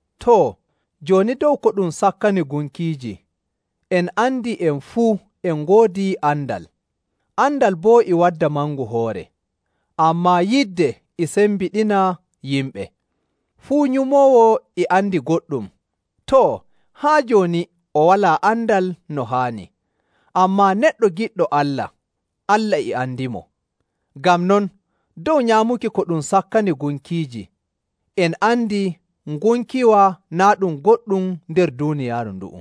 Too, jooni dow ko ɗum sakkani gunkiiji, en andi en fuu en ngoodi andal. Andal boo e wadda mangu hoore, ammaa yidde e sembiɗina yimɓe. Fuu nyumoowo e andi goɗɗum, too, haa jooni o walaa andal no haani. Ammaa neɗɗo giɗɗo Allah, Allah e andimo. Ngam non, dow nyaamuki ko ɗum sakkani gunkiiji, en andi ngunkiwa naa' ɗum goɗɗum nder duuniyaaru ndu'u,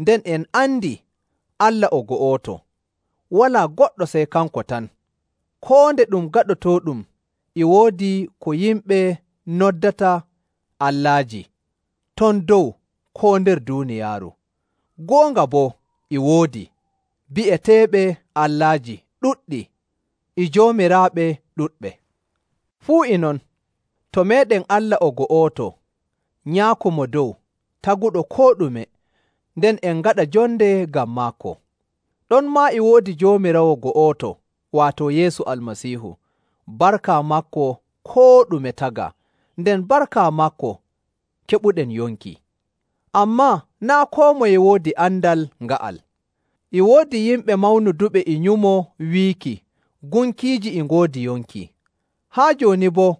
nden en andi Allah o go'oto, walaa goɗɗo sey kanko tan. Koo nde ɗum gaɗotooɗum e woodi ko yimɓe noddata “allaaji” ton dow koo nder duuniyaaru, goonga boo e woodi bi'eteeɓe “allaaji” ɗuɗɗi e “joomiraaɓe” ɗuɗɓe. Fuu e non, to meeɗen Allah o go'oto, Nyaako Mo Dow, taguɗo koo ɗume, nden en ngaɗa jonde ngam maako. Ɗonmaa e woodi Joomiraawo go'oto, waato Yeesu Almasiihu. Barka maako koo ɗume tagaa, nden barka maako keɓuɗen yonki. Ammaa naa' koo moye woodi andal nga'al. E woodi yimɓe mawnuduɓe e nyumo wiiki gunkiiji e ngoodi yonki. Haa jooni boo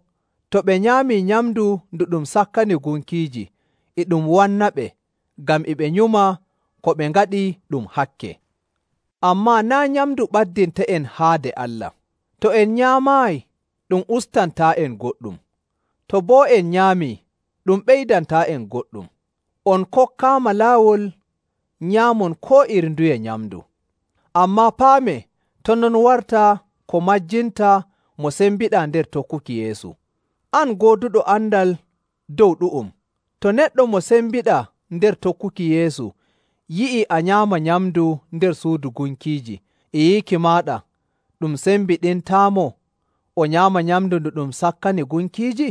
to ɓe nyaamii nyamndu ndu ɗum sakkani gunkiiji, e ɗum wannaɓe ngam e ɓe nyuma ko ɓe ngaɗi ɗum hakke. Ammaa naa' nyamndu ɓaddintaa'en haade Allah. To en nyaamaayi, ɗum ustantaa'en goɗɗum. To boo en nyaamii, ɗum ɓeydantaa'en goɗɗum. On kokkaama laawol nyaamon koo iri nduye nyamndu. Ammaa paamee to' non warta ko majjinta mo sembiɗaa nder tokkuki Yeesu. An gooduɗo andal dow ɗu'um, to neɗɗo mo sembiɗaa nder tokkuki Yeesu yi'ii a nyaama nyamndu nder suudu gunkiiji, e yiiki maaɗa ɗum sembiɗintaamo o nyaama nyamndu ndu ɗum sakkani gunkiiji?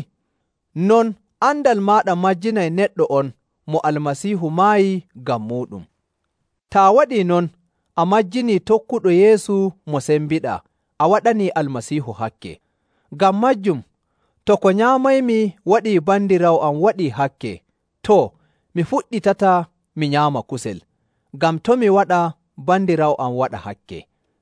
Non, andal maaɗa majjinay neɗɗo on mo Almasiihu maayi ngam muuɗum. Taa waɗii non, a majjinii tokkuɗo Yeesu mo sembiɗaa, a waɗanii Almasiihu hakke. Ngam maajum, to ko nyaamaymi waɗii bandiraawo am waɗii hakke, too, mi fuɗɗitataa mi nyaama kusel, ngam to' mi waɗa bandiraawo am waɗa hakke.